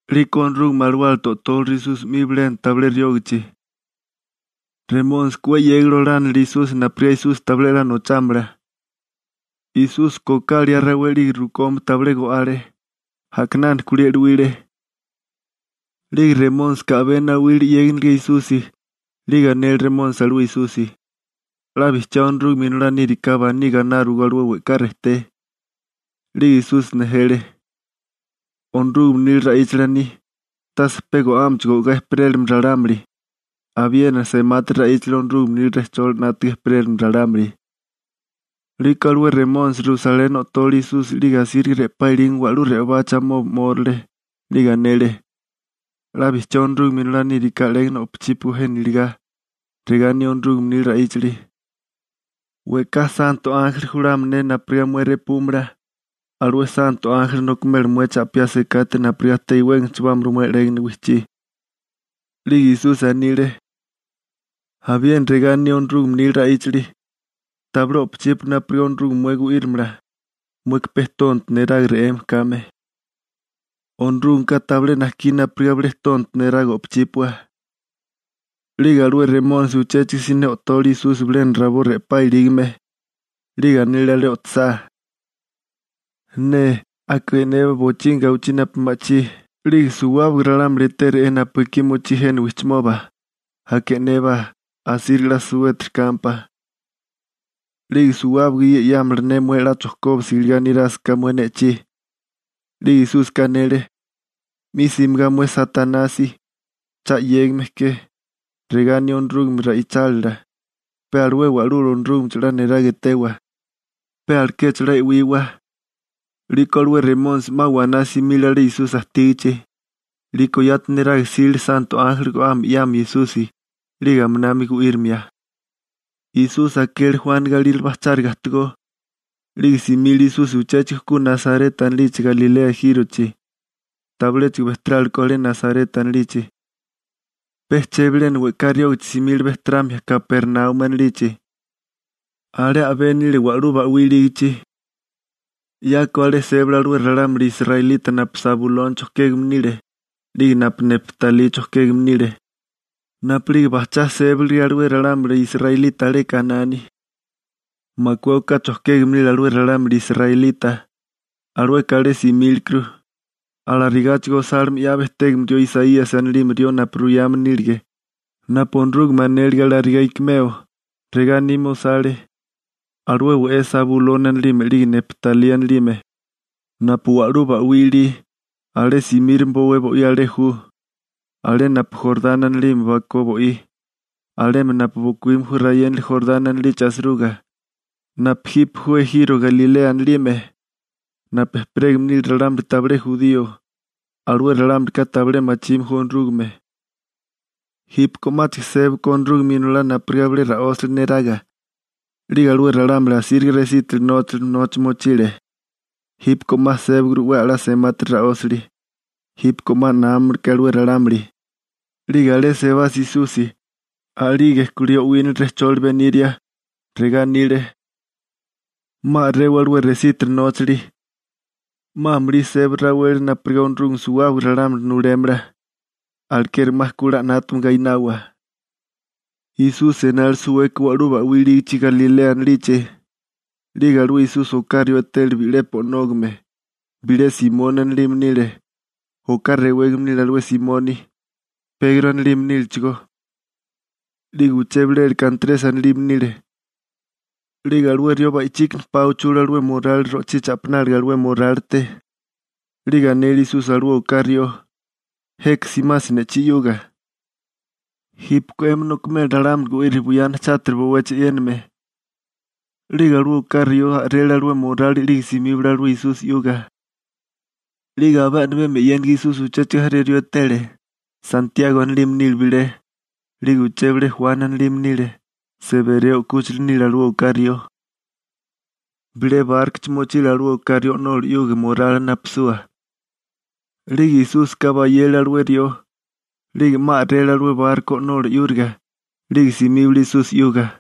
'Liko Onorúgame Alawálate o'tóleru Esusi 'mi bilena tabilé riógachi. Remónisika 'we 'yégali olánilile Esusi napurigá Esusi tabilé 'la nochámala. Esúsika oká liá rawé 'lige rukomi tabilé go'ale. A'kinana kulí e'luíle. 'Lige Remónisika a'bé nawile 'yéginiliga Esusi, 'lige anele Remónisi alué Esusi: ―'La bijchiá Onorúgame Inolá níriká, baní gaináriwagó alué we'ká rejté. 'Lige Esusi nejele: ―Onorúgame nila ra'íchali aní: «Tase pe go'ámecho go'gá ejperélamala ralámuli, abiena semátiri ra'íchali Onorúgame nila rejcholi 'nátaga ejperélamala ralámuli.» 'Liko alué Remónisi Rusaleni o'tole Esusi 'lige asíriga re'pá ilígame wa'lú re'obachi amoba 'mórale, 'lige anele: ―'La bijchiá Onorúgame Inolá níriká 'légana o'pachípuagó jena iligá. Regá aní Onorúgame nila ra'íchali: We'ká santo ánjeli julámala ne napurigá mué repúmala. Alué santo ánjeli nokimela mué cha'piá sekate napurigá ta iwégame chibámala mué 'légana wijchí. 'Lige Esusi anile: ―Abiena regá aní Onorúgame nila ra'íchali: «Tabilé o'pochípua napurigá Onorúgame mué gu'írimala, mueka pe tonto neraga re'eme kame.»Onorúgameka tabilé najkí napurigá bilé tonto neraga o'pachípua. 'Lige alué Remónisi uchéchigo siné o'tole Esusi bilena rabó re'pá ilígame, 'lige anele alé o'tosá: ―'Nee, aka e'nébá bochígimi gawichí napu ma'chí 'lige suwábaga ralámuli etéru'é napu ekí mochí jena wijchimoba, aka e'nébá asíriga 'la suwétiri kámpá. 'Lige suwábaga ye 'yámala ne mué 'la chojkóbisiga iligá nirásaká mué ne'chí. 'Lige Esúsika anele: ―'Mi simigá mué Satanasi, cha 'yégame ke. Regá aní Onorúgame ra'ichálila: «Pe alué Wa'lula Onorúgamecho 'la niraga etewa, pe alekecho 'la e'wiwa.» 'Liko alué Remónisi 'ma waná simile alé Esusi ajtígichi. 'Liko yati neraga jsile santo ánjeli go'ame 'yamia Esusi, 'lige aminami gu'írimia. Esusi akele Juani galírale bajcháriga ajtigó. 'Lige simile Esusi uchéchigo ku Nasareta anilichi Galilea ejírochi. Tabiléchigo bejterálekó alé Nasareta anilichi, pe chebilena we'ká riógichi simile bejteramia Kapernaumi anilichi. Alé a'bé nile wa'lú ba'wí ilígichi. 'Yako alé sébale alué ralámuli israelita napu Sabuloni chojkégame nile, 'lige napu Neptalí chojkégame nile napu'lige bajchá sébalige alué ralámuli israelita alé Kanani. Makué oká chojkégame nile alué ralámuli israelita. Alueka alé simílekuru, alarigáchigo osáligime 'ya bejtégame rió Isaíasi anilime, napu ruyame nílige napu Onorúgame anélige alarigá ikimeo. Regá anime osale: Alué we'é Sabuloni anilime 'lige Neptalí anilime, napu wa'lú ba'wí ilí, alé simírame bowé bo'í, alé ju, alé napu Jorani anilime bakó bo'í, alemi napu bokuíme ju rayénali Jorani anilichi asiruga, napu jipe ju ejiro Galilea anilime, napu ejperégame nile ralámuli tabilé jurío. Alué ralámulika tabilé machime ju Onorúgame. Jípeko 'máchigo sébako Onorúgame Inolá napurigá bilé ra'ósali neraga. 'Lige alué ralámuli asíriga resítiri nóchali nocha mochile. Jípeko 'ma sébaguru 'we a'lá semátiri ra'ósali. Jípeko 'ma námamaleké alué ralámuli. 'Lige alé sebasa Esusi, a'lige kulí o'wínale rejcholi beniria. Regá anile: ―'Ma a'rewa alué resítiri nóchali. 'Ma amulí seba raweli napurigá Onorúgame suwábaga ralámuli nulémala. Alekeri 'ma ku 'la 'nátame gainawa. Esusi enale suweke wa'lú ba'wí ilígichi Galilea anilichi. 'Lige alué Esusi oká rió etele bi'lepi o'nógame. Bilé Simoni anilime nile. Oká rewégame nile alué Simoni, Pegro anilime nílechigó. 'Lige uché bileka Antresi anilime nile. 'Lige alué rió ba'ichíkana pa uchule alué morali ro'chí cha'pináliga alué morálite. 'Lige anele Esusi alué oká rió: ―Jeka simasi ne'chí 'yuga. Jípeko 'emi nokimela ralámuli gu'iria buyana chátiri bowechi e'yéname. 'Lige alué oká rió a'rele alué morali 'lige simíbale alué Esusi 'yuga. 'Lige abé a'mibemi e'yéniga Esusi uchéchigo jaré rió etele. Santiago anilime nile bilé, 'lige uché bilé Juani anilime nile. Sebereo 'kúchila nile alué oká rió. Bilé bárkochi mochile alué oká rió o'nola 'yuga morali napisua. 'Lige Esúsika bayele alué rió. 'Lige 'ma a'rele alué barko o'nola 'yúriga, 'lige simíbale Esusi 'yuga.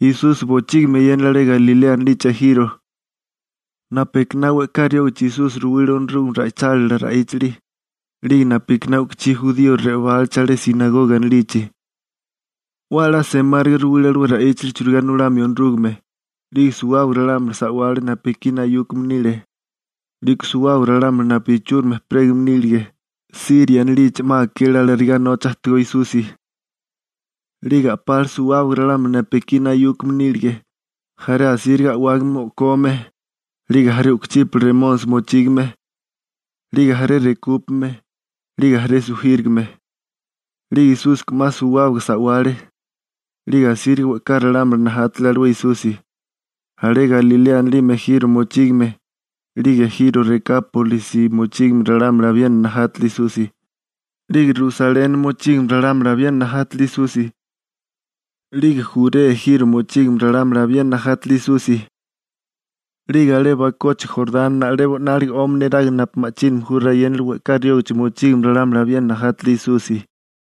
Esusi bochígimi eyénale alé Galilea anilichi ejiro. Napu ekiná we'ká riógichi Esusi ruwile Onorúgame ra'ichálila ra'íchali 'lige napu ekiná u'kuchí jurío re'obálachi alé «sinagoga» anilichi. 'We a'lá semáriga ruwile alué ra'íchali churigá nulamio Onorúgame. 'Lige suwábaga ralámuli sa'wale napu ekí nayúkame nile. 'Liko suwábaga ralámuli napu ichúrimi ejperégame nílige Siria anilichi 'ma akele alarigá nocha ajtigó Esusi. 'Lige a'pale suwábaga ralámuli napu ekí nayúkame nílige, jaré asíriga a'wágame o'kome, 'lige jaré u'kuchípala remónisi mochígame, 'lige jaré rekúpame, 'lige jaré sujírigame. 'Lige Esúsika 'ma suwábaga sa'wale. 'Lige asíriga we'ká ralámuli najátale alué Esusi. Alé Galilea anilime ejiro mochígame, 'lige ejiro Rekápolisi mochígame ralámuli abiena najátale Esusi, 'lige Rusaleni mochígame ralámuli abiena najátale Esusi. 'Lige Jurea ejiro mochígame ralámuli abiena najátele Esusi. 'Lige alé bakochi Jorani na'lebo 'nálige 'omi niraga napu ma'chínami ju rayénali we'ká riógachi mochígame ralámuli abiena najátale Esusi.